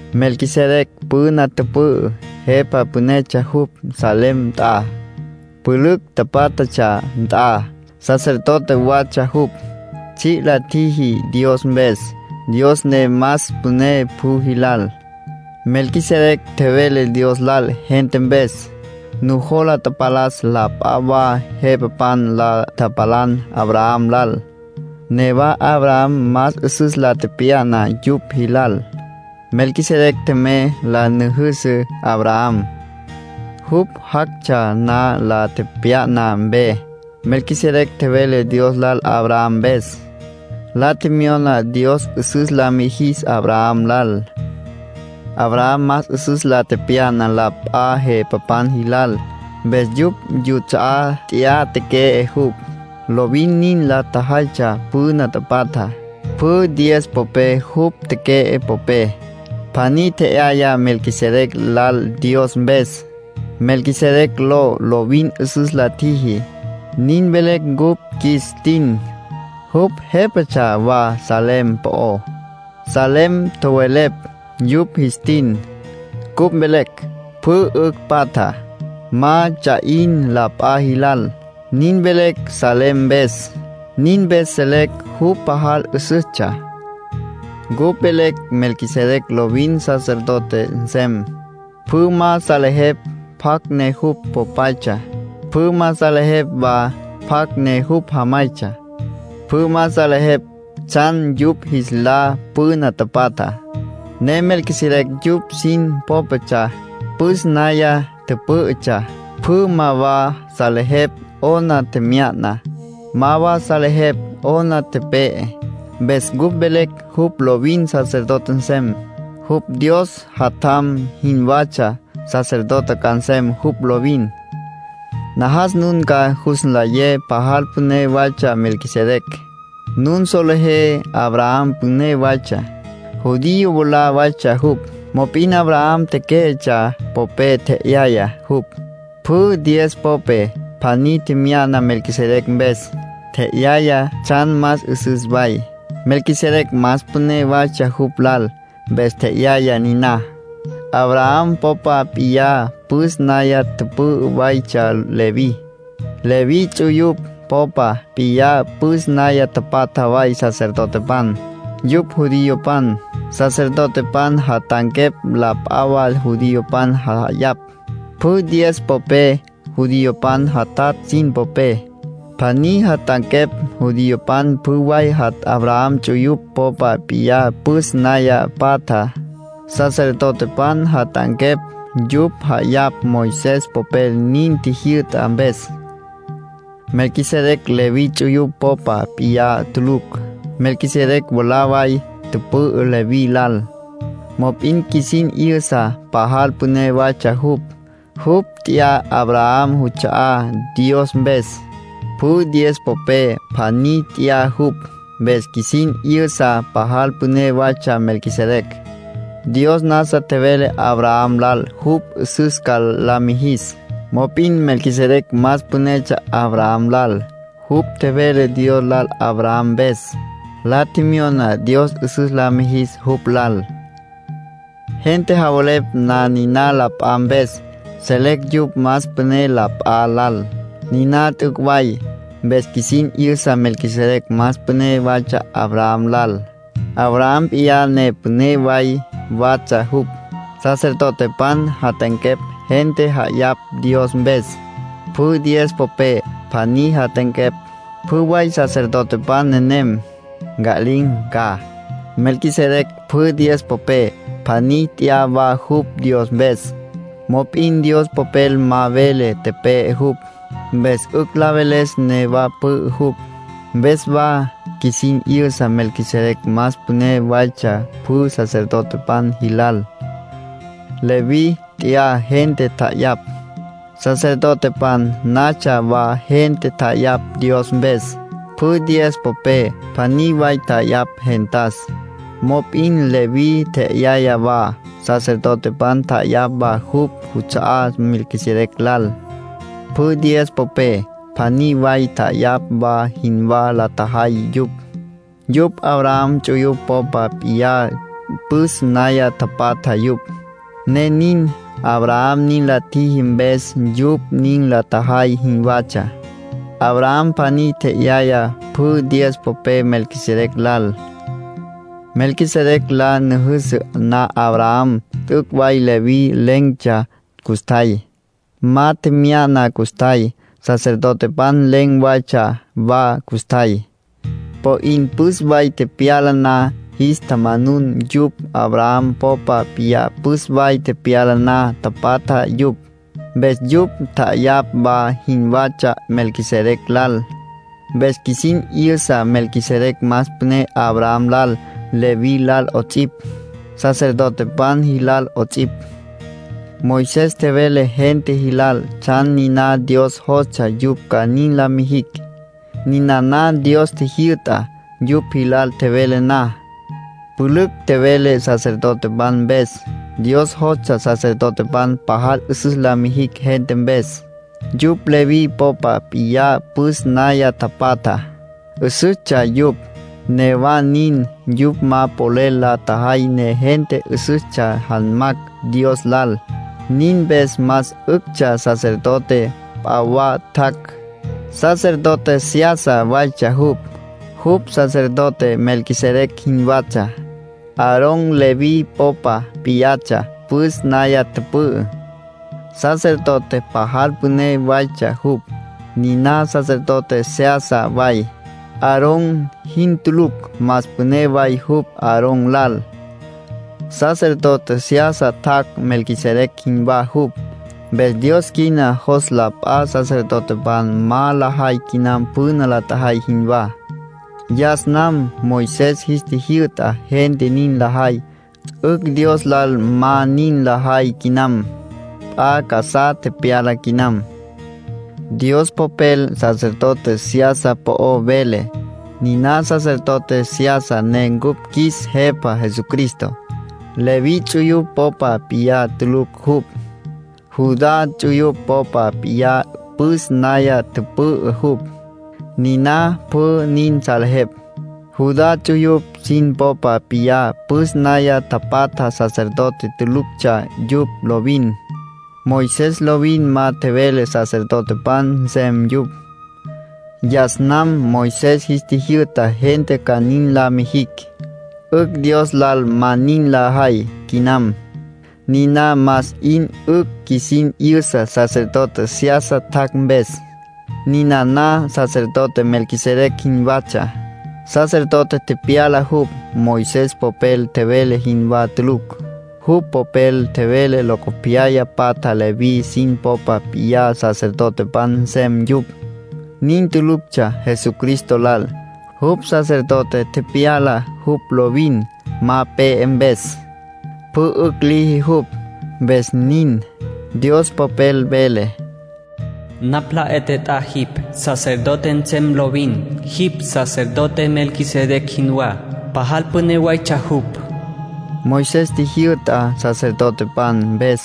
Melquisedec püna tüpü'ü, jepa pünetsja jupj Salem nt'a, pülücj pátjatsja nt'a. Sacerdote watsja jupj, tsji' la tjiji Dios mpes, Dios ne más püné pjü jilal. Melquisedec tjevele Dios lal gente mpes. Nujola tapalas la p'a wa jepapan la tapalan Abraham lal, newa Abraham más 'üsüs la tepya'na yupj jilal. Melquisedec tjemey la nüjüsü Abraham, jupj jactsja na la tepya'na mpe. Melquisedec tjevele Dios lal Abraham mpes, la tjemyona Dios 'üsüs la mijis Abraham lal. Abraham más 'üsüs la tepya'na la p'a jepapan jilal, mpes yupj yuts'a'á nt'ya teque'e jupj. Lovin nin la tjajaytsja püna tapatjá. Pjü diez popé jupj teque'e popé, pjaní tje'yaya Melquisedec lal Dios mpes. Melquisedec ló “Lovin 'üsüs la tjiji”, nin velecj cupj qjuis tin. Jupj jépatsja wa Salem po'ó. “Salem” tjowelepj yupj jis tin. Cupj velecj: “Pjü 'ücj patja, ma ts'a 'in la p'a jilal”. Nin velecj “Salem” mpes. Nin mpes selecj jupj pajal 'üsüstsja. Cupj velecj Melquisedec lovin sacerdote nsem. Pjü ma salejepj pjacj ne jupj popaytsja, pjü ma salejepj wa pjacj ne jupj jamaytsja. Pjü ma salejepj tsjan yupj jis lá püna tapatjá, ne Melquisedec yupj sin pópatsja, püs naya tüpǘ'ütsja. Pjü ma wa salejepj 'ona tjemya'na, ma wa salejepj 'ona tepe'e. Mpes cupj velecj jupj lovin sacerdote nsem. Jupj Dios Jatjam jinwatsja, sacerdote ca nsem jupj lovin. Najas nun ca jus nlayé pajal püné waytsja Melquisedec. Nun solejé Abraham püné waytsja. Judío mwalá waytsja jupj. Mop'in Abraham tequé'etsja popé tje'yaya jupj. Pjü diez popé, pjaní tje'yaya Melquisedec mpes. Tje'yaya tsjan más 'üsüs way. Melquisedec más püné waytsja jupj lal, mpes tje'yaya niná. Abraham popa p'iyá püs naya tüpü'ü waytsja Leví. Leví ts'uyupj popa p'iyá püs naya tapatja way sacerdotepan. Yupj judiopan. Sacerdotepan jat'anquepj la p'a wa judiopan ja'ayapj. Pjü diez popé judiopan jatatj sin popé, pjaní jat'anquepj. Judiopan pjü way Abraham ts'uyupj popa p'iyá püs naya patja. Sacerdotepan jat'anquepj yupj ja'ayapj Moisés popel nin tjijyü'ta mpes. Melquisedec Leví ts'uyupj popa p'iyá tulucj. Melquisedec mwalá way tüpü'ü Leví lal. Mop'in qjuisin 'yüsa pajal püné waytsja jupj; jupj nt'ya Abraham juts'a'á Dios mpes. Pjü diez popé, pjaní nt'ya jupj. Mpes qjuisin 'yüsa pajal püné waytsja Melquisedec. Dios nasa tjevele Abraham lal jupj 'üsüs ca la mijis. Mop'in Melquisedec más pünetsja Abraham lal. Jupj tjevele Dios lal Abraham mpes, la tjemyona Dios 'üsüs la mijis jupj lal. Gente javelepj na niná la p'a mpes, selecj yupj más püné la p'a lal. Niná t'üc' way. Mpes qjuisin 'yüsa Melquisedec más püné waytsja Abraham lal, Abraham p'iyá ne püné way watsja jupj. Sacerdotepan jat'anquepj gente ja'ayapj Dios mpes. Pjü diez popé, pjaní jat'anquepj. Pjü way sacerdotepan nenem, nca'lin̈ ca. Melquisedec pjü diez popé, pjaní nt'ya wa jupj Dios mpes. Mop'in Dios Popel ma vele tepe'e jupj. Mpes 'ücj la veles newa pü'ü jupj. Mpes wa qjuisin 'yüsa Melquisedec más püné waytsja pjü sacerdotepan jilal. Leví nt'ya gente tja'ayapj, sacerdotepan natsja wa gente tja'ayapj Dios mpes; pjü diez popé, pjaní way tja'ayapj gentas. Mop'in Leví tje'yaya wa, sacerdotepan tja'ayapj wa yupj yuts'a'á Melquisedec lal; pjü diez popé, pjaní way tja'ayapj wa jinwá la tjajay yupj. Yupj Abraham ts'uyupj popa p'iyá püs naya tapatja yupj, ne nin. Abraham nin la tjiji, mpes yupj nin la tjajay jinwatsja. Abraham pjaní tje'yaya pjü diez popé Melquisedec lal. Melquisedec la nüjüsü na Abraham, t'üc' way Leví len̈tsja custjay, ma tjemya'na custjay. Sacerdotepan len̈ waytsja wa custjay. Po 'in püs way tepyala na, jis tjamanun yupj. Abraham popa p'iyá püs way tepyala na tapatja yupj. Mpes yupj tja'ayapj wa jinwatsja Melquisedec lal. Mpes qjuisin 'yüsa Melquisedec más püné Abraham lal, Leví lal 'ots'ipj, sacerdotepan jilal 'ots'ipj. Moisés tjevele gente jilal tsjan niná Dios jostsja yupj ca nin la mijicj. Ninana Dios tjijyü'tá. Yupj jilal tjevele na, pülücj tjevele sacerdotepan mpes. Dios jostsja sacerdotepan pajal 'üsüs la mijicj gente mpes. Yupj Leví popa p'iyá püs naya tapatja. 'Üsüstsja yupj; newa nin, yupj ma polel la tjajay ne gente 'üsüstsja janmacj Dios lal. Nin mpes más 'üctsja sacerdote p'a wa tjac'; sacerdote seyasa waytsja jupj, jupj sacerdote Melquisedec jinwatsja. Aarón Leví popa p'iyatsja püs naya tüpü'ü, sacerdote pajal püné waytsja jupj. Niná sacerdote seyasa way, Aarón jin tulucj. Más püné way jupj Aarón lal. Sacerdote seyasa tjac', Melquisedec jinwá jupj, mpes Dios quina jos la p'a sacerdotepan ma lajay quinam püna la tjajay jinwá. Yas nam Moisés jis tjijyü'ta gente nin lajay, 'ücj Dios lal ma nin lajay quinam. P'a casá tepyala quinam. Dios Popel sacerdote seyasa po'ó vele. Niná sacerdote seyasa ne cupj qjuis Jepa Jesucristo. Leví ts'uyupj popa p'iyá tulucj jupj. Judá ts'uyupj popa p'iyá püs naya tüpü'ü jupj, niná pjü nin salejepj. Judá ts'uyupj sin popa p'iyá püs naya tapatja sacerdote tuluctsja yupj lovin. Moisés lovin ma tjevele sacerdotepan nsem yupj. Yas nam Moisés jis tjijyü'ta gente ca nin la mijicj, 'ücj Dios lal ma nin lajay quinam. Niná más 'in 'ücj qjuisin 'yüsa sacerdote seyasa tjac' mpes. Ninana sacerdote Melquisedec jinwatsja. Sacerdote tepyala jupj, Moisés popel tjevele jinwá tulucj. Jupj popel tjevele locopyaya patja Leví sin popa p'iyá sacerdotepan nsem yupj. Nin tuluctsja Jesucristo lal. Jupj sacerdote tepyala jupj lovin ma pe'e mpes; pjü 'ücj liji jupj, mpes nin. Dios Popel vele: “Napj la 'e tjet'á jipj, sacerdote nsem lovin. Jipj sacerdote Melquisedec jinwá, pajal püné waytsja jupj.” Moisés tjijyü'ta sacerdotepan mpes.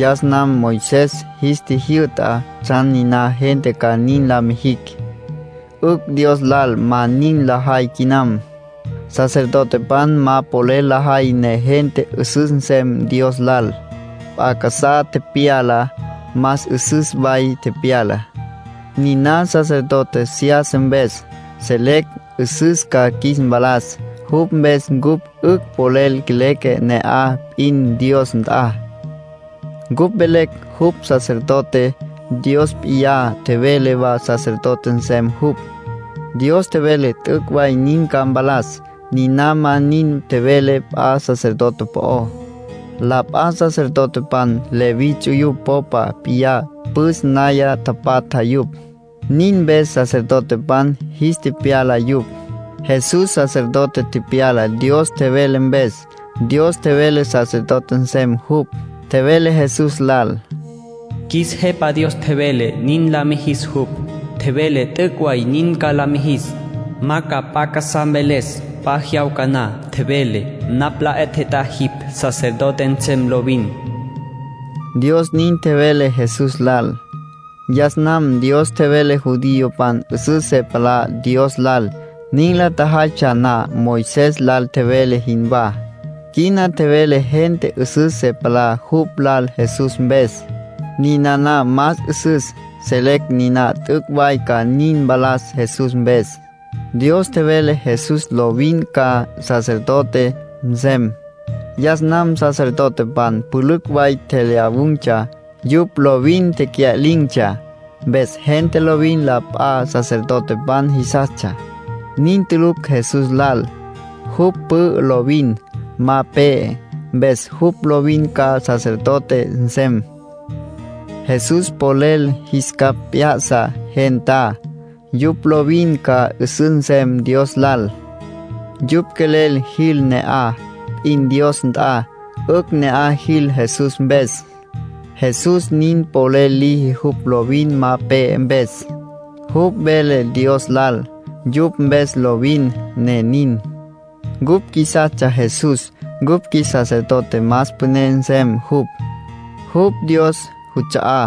Yas nam Moisés jis tjijyü'ta tsjan niná gente ca nin la mijicj; 'ücj Dios lal ma nin lajay quinam. Sacerdotepan ma polel lajay ne gente 'üsüs nsem Dios lal. P'a casá tepyala. Más 'üsüs way tepyala. Niná sacerdote seyasa mpes, selecj 'üsüs ca qjuis mpalas. Jupj mpes cupj 'ücj polel leque ne'aj p'in Dios nt'a. Cupj velecj jupj sacerdote; Dios p'iyá tjevele wa sacerdote nsem jupj. Dios tjevele t'üc' way nin ca mpalas. Niná ma nin tjevele p'a sacerdote po'ó. La p'a sacerdotepan Leví ts'uyupj popa p'iyá püs naya tapatja yupj, nin mpes sacerdotepan jis tepyala yupj. Jesús sacerdote tepyala Dios tjevele mpes. Dios tjevele sacerdote nsem jupj. Tjevele Jesús lal: “Qjuis Jepa Dios tjevele nin la mijis jupj, tjevele t'üc' way nin ca la mijis. Ma ca p'a casá mveles p'a jyawca na. Tjevele: ‘Napj la 'e tjet'á jipj, sacerdote nsem lovin’.” Dios nin tjevele Jesús lal. Yas nam Dios tjevele judiopan 'üsüs se palá Dios lal, nin la tjajaytsja na Moisés lal tjevele jinwá. Quina tjevele gente 'üsüs se palá jupj lal Jesús mpes. Ninana más 'üsüs. Selecj niná t'üc' way ca nin mpalas Jesús mpes. Dios tjevele Jesús lovin ca sacerdote nsem. Yas nam sacerdotepan pülücj way tjelyawun̈tsja. Yupj lovin tecya'lin̈tsja, mpes gente lovin la p'a sacerdotepan jisastsja. Nin tulucj Jesús lal; jupj pü'ü lovin. Ma pe'e. Mpes jupj lovin ca sacerdote nsem. Jesús polel jis capj p'ya'sa gentá, yupj lovin ca 'üsüs nsem Dios lal. Yupj quelel jil ne'aj p'in Dios nt'a, 'ücj ne'aj jil Jesús mpes. Jesús nin polel liji jupj lovin ma pe'e mpes. Jupj vele Dios lal yupj mpes lovin, ne nin. Cupj qjuisastsja Jesús cupj qjuis sacerdote más püné nsem jupj. Jupj Dios juts'a'á.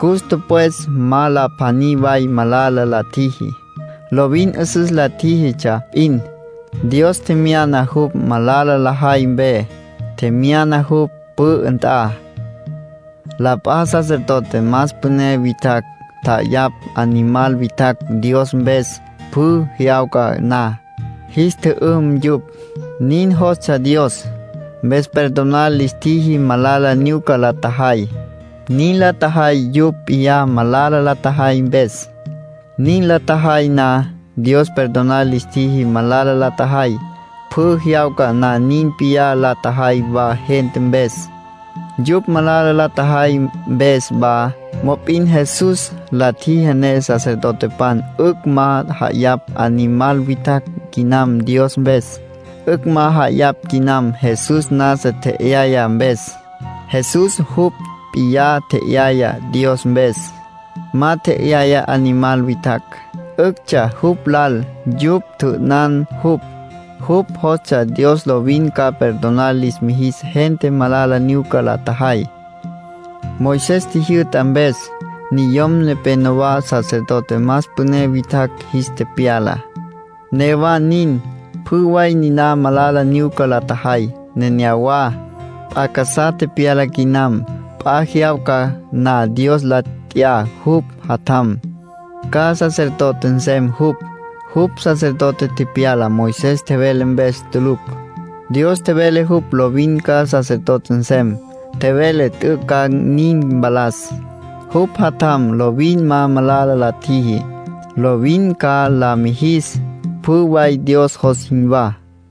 Cus tüpwes ma la pjaní way malala la tjiji. Lovin 'üsüs la tjíjitsja p'in. Dios tjemyana jupj malala lajay mpe, tjemyana jupj pü'ü nt'a. La p'a sacerdote más püné witjacj tja'ayapj animal witjacj Dios mpes pjü jyawca na; jis tjü'üm yupj. Nin jostsja Dios, mpes perdonar lis tjiji malala nyuca la tjajay. Nin la tjajay yupj p'iyá malala la tjajay mpes. Nin la tjajay na, Dios perdonar lis tjiji malala la tjajay. Pjü jyawca na nin p'iyá la tjajay wa gente mpes, yupj malala la tjajay mpes wa. Mop'in Jesús la tjiji ne sacerdotepan 'ücj ma ja'ayapj animal witjacj quinam Dios mpes. 'Ücj ma ja'ayapj quinam Jesús nasa tje'yaya mpes. Jesús jupj p'iyá tje'yaya Dios mpes, ma tje'yaya animal witjacj. 'Üctsja jupj lal yupj tjü'ünan jupj; jupj jostsja Dios lovin ca perdonar lis mijis gente malala nyuca la tjajay. Moisés tjijyü'ta mpes, niyom nepénowa sacerdote más püné witjacj jis tepyala. Newa nin, pjü way niná malala nyuca la tjajay neneyawá. P'a casá tepyala quinam. P'a jyawca na Dios la t'ya jupj Jatjam, ca sacerdote nsem jupj. Jupj sacerdote tepyala, Moisés tjevele mpes tulucj. Dios tjevele jupj lovin ca sacerdote nsem. Tjevele t'üc' ca nin mpalas. Jupj Jatjam lovin ma malala la tjiji. Lovin ca la mijis pjü way Dios jos jinwá.